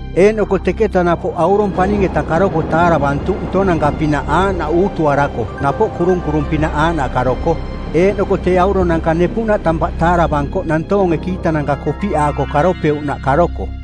Eeꞌnoko teketa napoꞌ aurong paning-eta karoko taaravantuꞌ ntonanka-pinaꞌ aaꞌnaꞌ uutuarako napoꞌ kurunkurung-pinaꞌ aaꞌnaꞌ karoko, eeꞌnoko tee auronanka nepuꞌnaꞌ tampaꞌ taaravankoꞌ nantoonge kiitananka kopiꞌaako karopeuꞌnaꞌ karoko.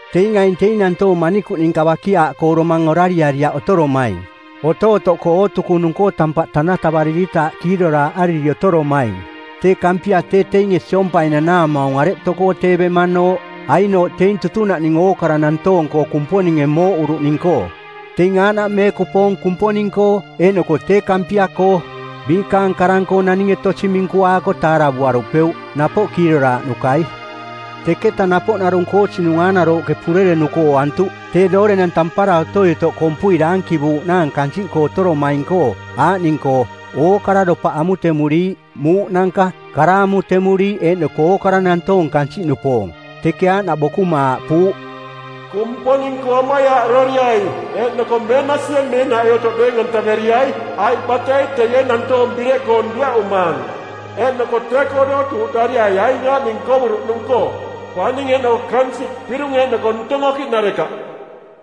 Teing aing teing nantoong manikuꞌ ninka bakiaaꞌkoo domang orariariaꞌ otoromaing. Otootoꞌkoo ootukunung-koo tampaꞌ tanatavariritaaꞌ kiiroraaꞌariri otoromaing. Tee Kampia tee teinge siompai nanaamaung areꞌ tokoo tee bemanooꞌ. Ainooꞌ teing tutunaꞌning ookara nantoong-koo Kumponinge mooꞌuruꞌning-koo. Teing aaꞌnaꞌ meekupoong Kumponing-koo, eeꞌnoko tee Kampia-koo. Biikaang karang-koo naninge tosi minkuaako taaravuarupeuꞌ, napoꞌ kiiroraaꞌnukai. Teketa napoꞌ narung koosinung aanarooꞌke purerenuko ooantuꞌ, tee doorenang tampara otoi otoꞌ kompui daankivuuꞌnaang kansiꞌkoo otoromaing-koo aaꞌning-koo: ookara dopaꞌ amutemuriiꞌ, muuꞌnanka, kara amutemuriiꞌ eeꞌnoko ookara nantoong kansiꞌnupoong. Teke aaꞌnaꞌ bokuma aaꞌpuuꞌ, “Kumponing-koo amaiaaꞌroriai eeꞌnoko meenasie meeꞌnaꞌoi otoꞌ deeng-antaveriai, aiꞌ batei teie nantoong bireꞌkoong dueꞌumaang. Eeꞌnoko tee-koo dootuuꞌdariai aing aaꞌning ookara nkovuruꞌnung-koo: paning eeꞌnoko kansiꞌ, pirung eeꞌnoko ntong okiꞌnarekaꞌ.”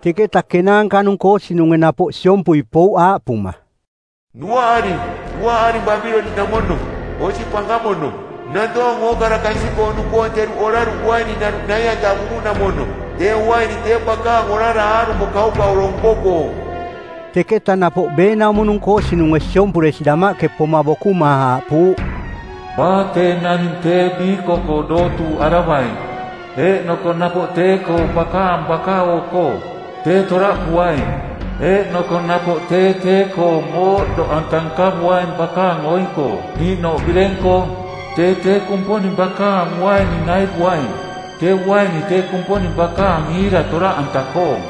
Teketa kenaanka-nung koosinunge napoꞌ siompui pouꞌ aaꞌpuma, “Duaꞌaring, duaꞌaring Babiloniꞌnamono, osi pankamono, nantoong ookara kansiꞌkoo-nupoong teruꞌ oraruꞌ uaininaruꞌ nai-antavuruꞌnamono. Tee uaini tee bakaang orara aarumo kaukauro nko-koong.” Teketa napoꞌ beenaumo-nung koosinunge siompuresi damaꞌke poma bokuma aaꞌpuuꞌ, “Baa tee naning tee biiko-koo dootuuꞌaravaing, eeꞌnoko napoꞌ tee-koong bakaang baka-oo-koo, tee toraꞌpuaing, eeꞌnoko napoꞌ tee tee-koong mooꞌdoꞌanta nkavuaing bakaang oing-koo niiꞌnooꞌ bireng-koo. Tee tee Kumponing bakaang uaini naivuaing, tee uaini tee Kumponing bakaang iira toraꞌanta-koong,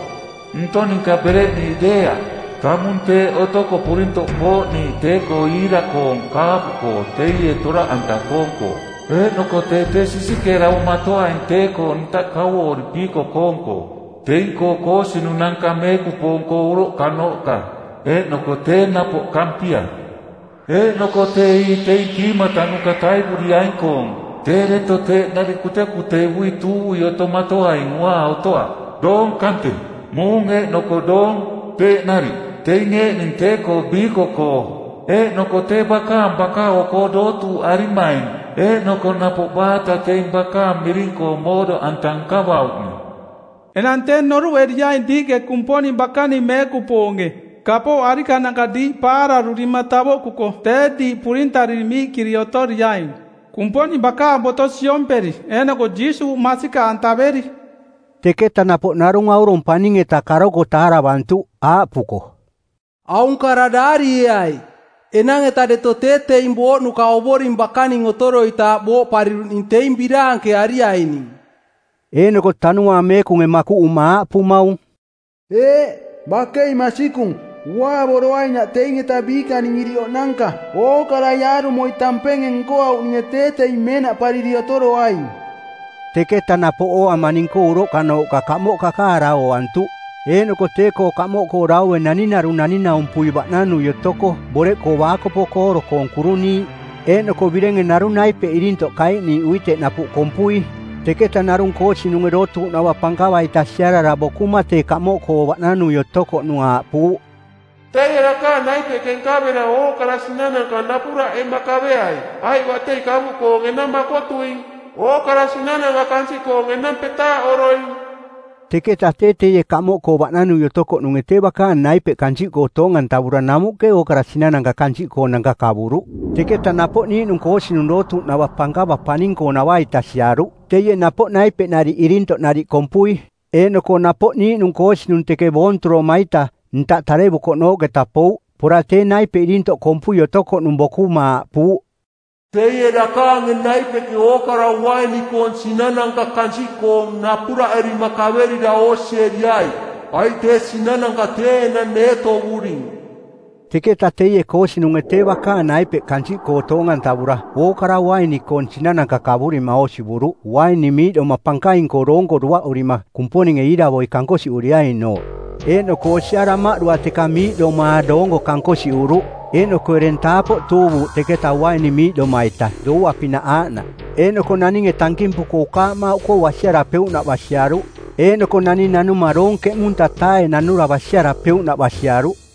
ntong ninka bereꞌniiꞌ deeaꞌ, tamung teeꞌ otoko purintoꞌ kooꞌniiꞌ tee-koo iira-koong kaapu-koo teie toraꞌanta-koong-koo. Eeꞌnoko tee tee sisikeeravomatoaing tee-koo ntaꞌ kauoori piiko-koong-koo teing-koo koosinunanka meekupoong-koo uroꞌkanooꞌka eeꞌnoko tee napoꞌ Kampia. Eeꞌnoko tee ii teing kiimatanuka taivuriaing-koong tee deto teeꞌ nariꞌ kutekuteivui tuuvui otomatoaing uaa otoaꞌ, doong kante, muung eeꞌnoko doong, teeꞌ nariꞌ. Teing eeꞌning tee-koo biiko-koo eeꞌnoko tee bakaang baka-oo-koo dootuuꞌarimaing eeꞌnoko napoꞌ baata teing bakaang miring-koo mooꞌdoꞌanta nkavauꞌning. Enang tee noruꞌeriaing diiꞌke Kumponing bakaning meekupoonge, kapooꞌ arikananka diiꞌ paararurima tavoꞌkuko tee diiꞌ purintariri miiꞌkiri otoriaing, Kumponing bakaang boto siomperi eeꞌnoko Jiisuuꞌ masikaꞌantaveri.” Teketa napoꞌ narung aurong paning-eta karoko taaravantuꞌ, aaꞌpuko, “Aung kara daarieai, ‘Enang-eta deto tee teing booꞌnuka Ovoring bakaning otoroitaaꞌ booꞌpariruꞌning teing biraankeariaining.’” Eeꞌnoko Tanuaang Meekunge makuꞌuma aaꞌpumaung, “Eeꞌ, bakei masikung. Uaavoroainaꞌ teing-eta biikaning iriꞌoꞌnanka. Ookarai aarumoi tampenge nkoauꞌninge tee teing meenaꞌpariri otoroaing.” Teketa napoꞌ ooama ning-koo uroꞌkanooꞌka kamoꞌ kakaara ooantuꞌ, eeꞌnoko tee-koo kamoꞌkoo daue naning narung naning-naumpui baꞌnanui otoko boreꞌkoo baakopo kooro-koong kuruniiꞌ eeꞌnoko birenge narung naipeꞌ irintoꞌ kaiꞌniiꞌ uiteꞌ napuꞌ kompui. Teketa narung koosinunge dootuuꞌnava pankava-ita siarara bokuma tee kamoꞌkoo baꞌnanui otokoꞌnung aaꞌpuuꞌ, “Teie dakaang naipeꞌke nkavera ookara sinananka napuraꞌema kaveai, aiꞌ batei kavuꞌkoong enang makotuing. Ookara sinananka kansiꞌkoong enang petaaꞌoroing.” Teketa tee teie kamoꞌkoo baꞌnanui otokoꞌnunge tee bakaang naipeꞌ kansiꞌkoo toong-antavura namuꞌke ookara sinananka kansiꞌkoonanka kavuruꞌ. Teketa napoꞌ niiꞌnung koosinung dootuuꞌnava pankava paning-koonava-ita siaruꞌ, teie napoꞌ naipeꞌnariꞌ irintoꞌnariꞌ kompui. Eeꞌnoko napoꞌ niiꞌnung koosinung teke boonturoma-ita, ntaꞌ tarevumanooꞌketa pouꞌ. Pora tee naipeꞌ irintoꞌ kompui otokoꞌnung bokuma aaꞌpuuꞌ, “Teie dakaange naipeꞌke ookara uaini-koong sinananka kansiꞌkoong napuraꞌerima kaverira oosieriai, aiꞌ tee sinananka tee enang neetovuring.” Teketa teie koosinunge tee bakaang naipeꞌ kansiꞌkoo toong-antavura ookara uaini-koong sinananka kavurima oosivuruꞌ uaini miiꞌdoma pankaing-koo doonko duaꞌurima Kumponinge iiravoi kankosiꞌuriainooꞌ. Eeꞌnoko osia damaꞌdua teka miiꞌdomaa doonko kankosiꞌuruꞌ, eeꞌnoko ereng taapoꞌ tuuvuuꞌ teketa uainimiiꞌdoma-ita doua-pinaꞌ aaꞌnaꞌ. Eeꞌnoko naninge tankimpuko ukaamauꞌkoo basiarapeuꞌnaꞌ basiaruꞌ. Eeꞌnoko naning nanuma doong ˜keꞌmunta-taae nanura basiarapeuꞌnaꞌ basiaruꞌ.